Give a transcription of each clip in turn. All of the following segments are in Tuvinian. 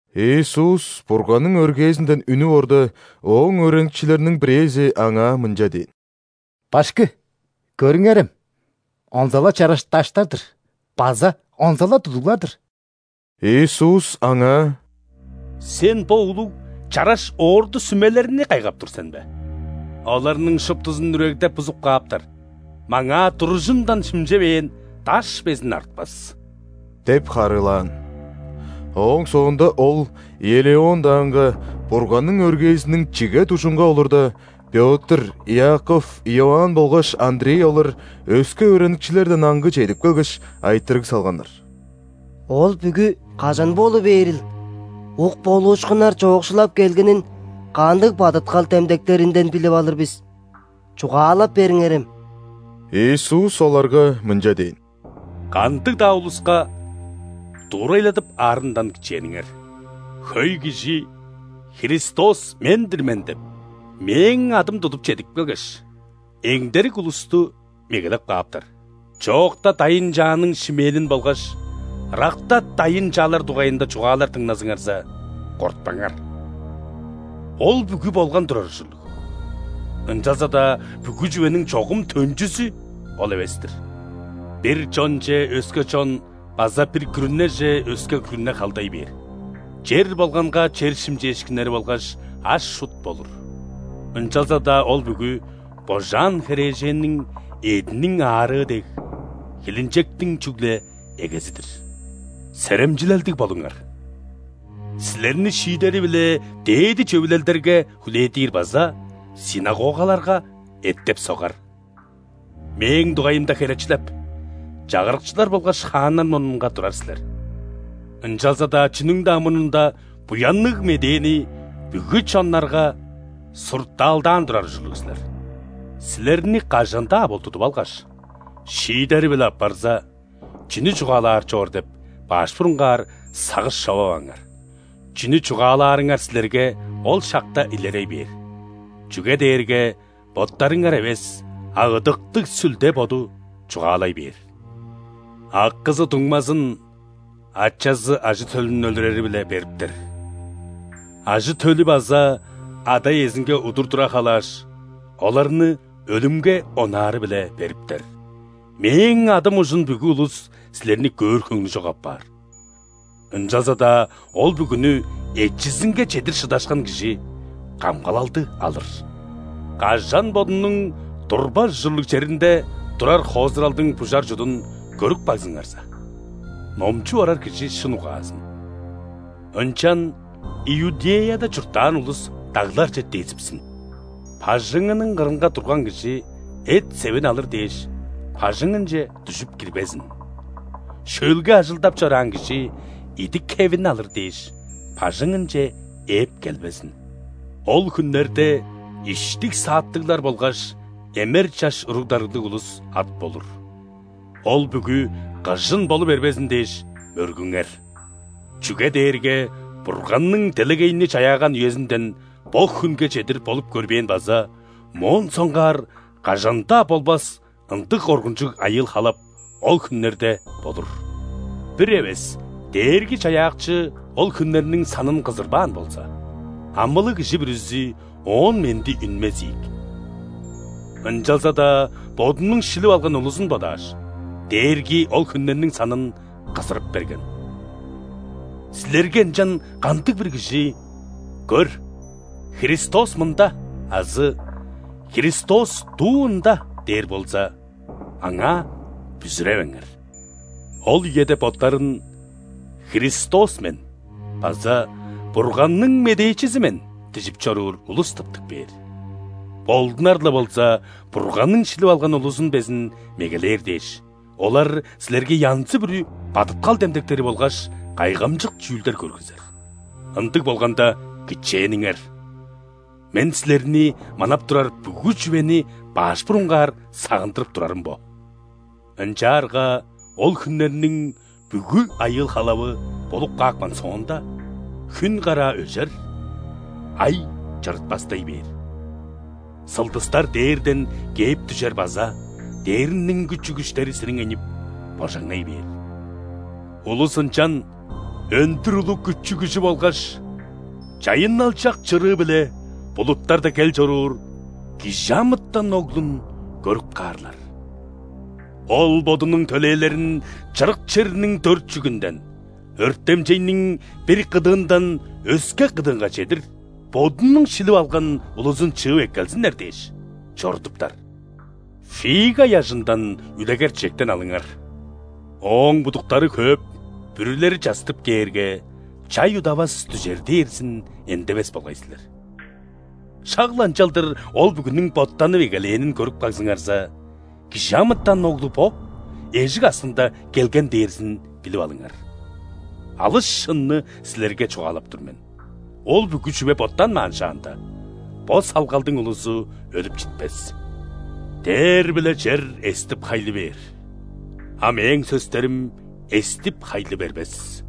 Иисус Бурганның өргээзинден үнүп орда, Ооң өөреникчилериниң бирээзи Аңаа мынча дээн: «Башкы! Көрүңерем, онза-ла чараш даштар-дыр база онза-ла тудуглар-дыр!» Иисус аңаа: «Сен бо улуг, чараш орду-сүмелерни кайгап тур сен бе? Оларның шуптузун үрегдеп-бузуп кааптар, маңаа туружундан шимчевээн даш безин артпас» – деп харыылаан. Ооң соонда Ол Елеон даанга, Бурганның өргээзиниң чиге дужунга олурда, Пётр, Иаков, Иоанн болгаш Андрей олар өске өөреникчилерден аңгы чедип келгеш, айтырыг салганнар: «Ол бүгү кажан болу бээрил, ук болуушкуннар чоокшулап келгенин кандыг бадыткал демдектеринден билип алыр бис, чугаалап бериңерем?» Иисус оларга мынча дээн: «Кандыг-даа улуска дуурайладып аарындан кичээниңер. Хөй кижи: „Христос – мен-дир мен“ – деп, Мээң адым тудуп чедип келгеш, эңдерик улусту мегелеп кааптар. Чоокта дайын-чааның шимээнин болгаш ыракта дайын-чаалар дугайында чугаалар дыңназыңарза, кортпаңар. Ол бүгү болган турар ужурлуг, ынчалза-даа бүгү чүвениң чогум төнчүзү ол эвес-тир. Бир чонче өске чон база бир күрүнеже өске күрүне халдай бээр. Чер болганга чер шимчээшкиннери болгаш аш-чут болур. Ынчалза-даа ол бүгү, божаан херээженниң эъдиниң аарыы дег, хилинчектиң чүгле эгези-дир. Серемчилелдиг болуңар! Силерни шиидери-биле дээди Чөвүлелдерге хүлээдир база ·синагогаларга эттеп-согар. Мээң дугайымда херечилеп, чагырыкчылар болгаш хааннар мурнунга турар силер. Ынчалза-даа чүнүң-даа мурнунда Буянныг Медээни бүгү чоннарга суртаалдаан турар ужурлуг силер. Силерни кажан-даа бол тудуп алгаш, шиидери-биле аппарза, чүнү чугаалаар чоор деп, баш бурунгаар сагыш човаваңар. Чүнү чугаалаарыңар силерге ол шакта илерей бээр, чүге дээрге боттарыңар эвес, а Ыдыктыг Сүлде Боду чугаалай бээр. Акызы дуңмазын, ачазы ажы-төлүн өлүрери-биле бериптер. Ажы-төлү база ада-иезинге удур тура халааш, оларны өлүмге онаары-биле бериптер. Мээң адым ужун бүгү улус силерни көөр хөңнү чок апаар. Ынчалза-даа ол бүгүнү эчизинге чедир шыдашкан кижи камгалалды алыр». «Кажан бодунуң турбас ужурлуг черинде турар хоозуралдың бужар чудун көрүп кагзыңарза (номчуп орар кижи шын угаазын!), ынчан Иудеяда чурттаан улус дагларже дезипсин. Бажыңының кырынга турган кижи, эт-севин алыр дээш, бажыңынче дүжүп кирбезин. Шөлге ажылдап чораан кижи, идик-хевин алыр дээш, бажыңынче ээп келбезин. Ол хүннерде иштиг-сааттыглар болгаш эмер чаш уруг-дарыглыг улус ат болур! Ол бүгү кыжын болу бербезин дээш, мөргүңер. Чүге дээрге Бурганның делегейни чаяаган үезинден бо хүнге чедир болуп көрбээн база моон соңгаар кажан-даа болбас ындыг коргунчуг айыыл-халап ол хүннерде болур. Бир эвес Дээрги-Чаяакчы ол хүннерниң санын кызырбаан болза, амылыг кижи бүрүзү оон менди үнмес ийик. Ынчалза-даа Бодунуң шилип алган улузун бодааш, Дээрги ол хүннерниң санын кызырып берген. Силерге ынчан кандыг-бир кижи: „Көр, Христос мында!“ азы: „Христос дуу ында!“ – дээр болза, аңаа бүзүревеңер. Ол үеде боттарын „Христос мен“ база „Бурганның медээчизи мен“ дижип чоруур улус тыптып кээр. Болдунар-ла болза, Бурганның шилип алган улузун безин мегелээр дээш, олар силерге янзы-бүрү бадыткал демдектери болгаш кайгамчык чүүлдер көргүзер. Ындыг болганда, кичээниңер. Мен силерни манап турар бүгү чүвени баш бурунгаар сагындырып турарым бо». «Ынчаарга ол хүннерниң бүгү айыыл-халавы болуп каапкан соонда,хүн караа өжер, ай чырытпастай бээр, сылдыстар дээрден кээп дүжер базадээрниң күчү-күштери сириңейнип, божаңнай бээр. Улус ынчан өндүр улуг күчү-күжү болгаш чайынналчак чырыы-биле булуттарда кел чоруур ·Кижи амытан Оглун көрүп каарлар. Ол Бодунуң төлээлерин чырык черниң дөрт чүгүнден, өртемчейниң бир кыдыындан өске кыдыынга чедир Бодунуң шилип алган улузун чыып эккелзиннер дээш, чорудуптар». «Фига ыяжындан үлегер-чижектен алыңар: ооң будуктары хөөп, бүрүлери частып кээрге, чай удавас дүжер дээрзин эндевес болгай силер. Шак-ла ынчалдыр ол бүгүнүң боттанып эгелээнин көрүп кагзыңарза, ·Кижи амытан Оглу бо, эжик аксында келген дээрзин билип алыңар. Алыс шынны силерге чугаалап тур мен: ол бүгү чүве боттанмаан шаанда, бо салгалдың улузу өлүп читпес. Дээр биле чер эстип-хайлы бээр, а Мээң сөстерим эстип-хайлы бербес».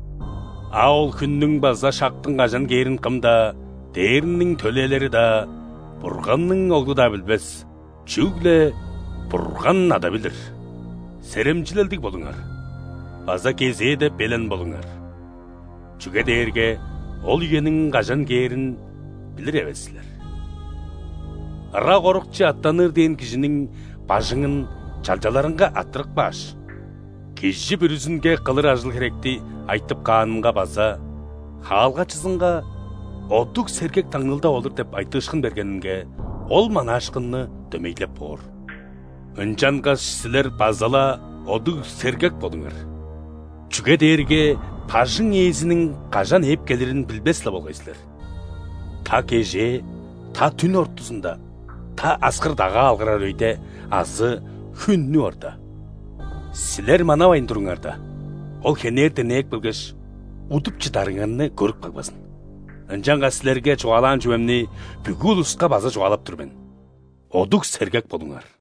«А ол хүннүң база шактың кажан кээрин кым-даа: ·дээрниң төлээлери-даа, Бурганның Оглу-даа билбес – чүгле Бурган Ада билир. Серемчилелдиг болуңар база кезээде белен болуңар, чүге дээрге ол үениң кажан кээрин билир эвес силер. Ырак орукче аъттаныр дээн кижиниң бажыңын чалчаларынга арттырып кааш, кижи бүрүзүнге кылыр ажыл-херекти айтып каанынга база хаалгачызынга „Одуг-сергек таңныылдап олур“ деп айтыышкын бергенинге ол манаашкынны дөмейлеп боор. Ынчангаш силер база-ла одуг-сергек болуңар! Чүге дээрге бажың Ээзиниң кажан ээп келирин билбес-ле болгай силер: та кежээ, та дүн ортузунда, та аскыр-дагаа алгырар өйде азы хүн үнүп орда... Силер манавайн туруңарда, Ол хенертен ээп келгеш, удуп чыдарыңарны көрүп кагбазын! Ынчангаш силерге чугаалаан чүвемни бүгү улуска база чугаалап тур мен: одуг-сергек болуңар!»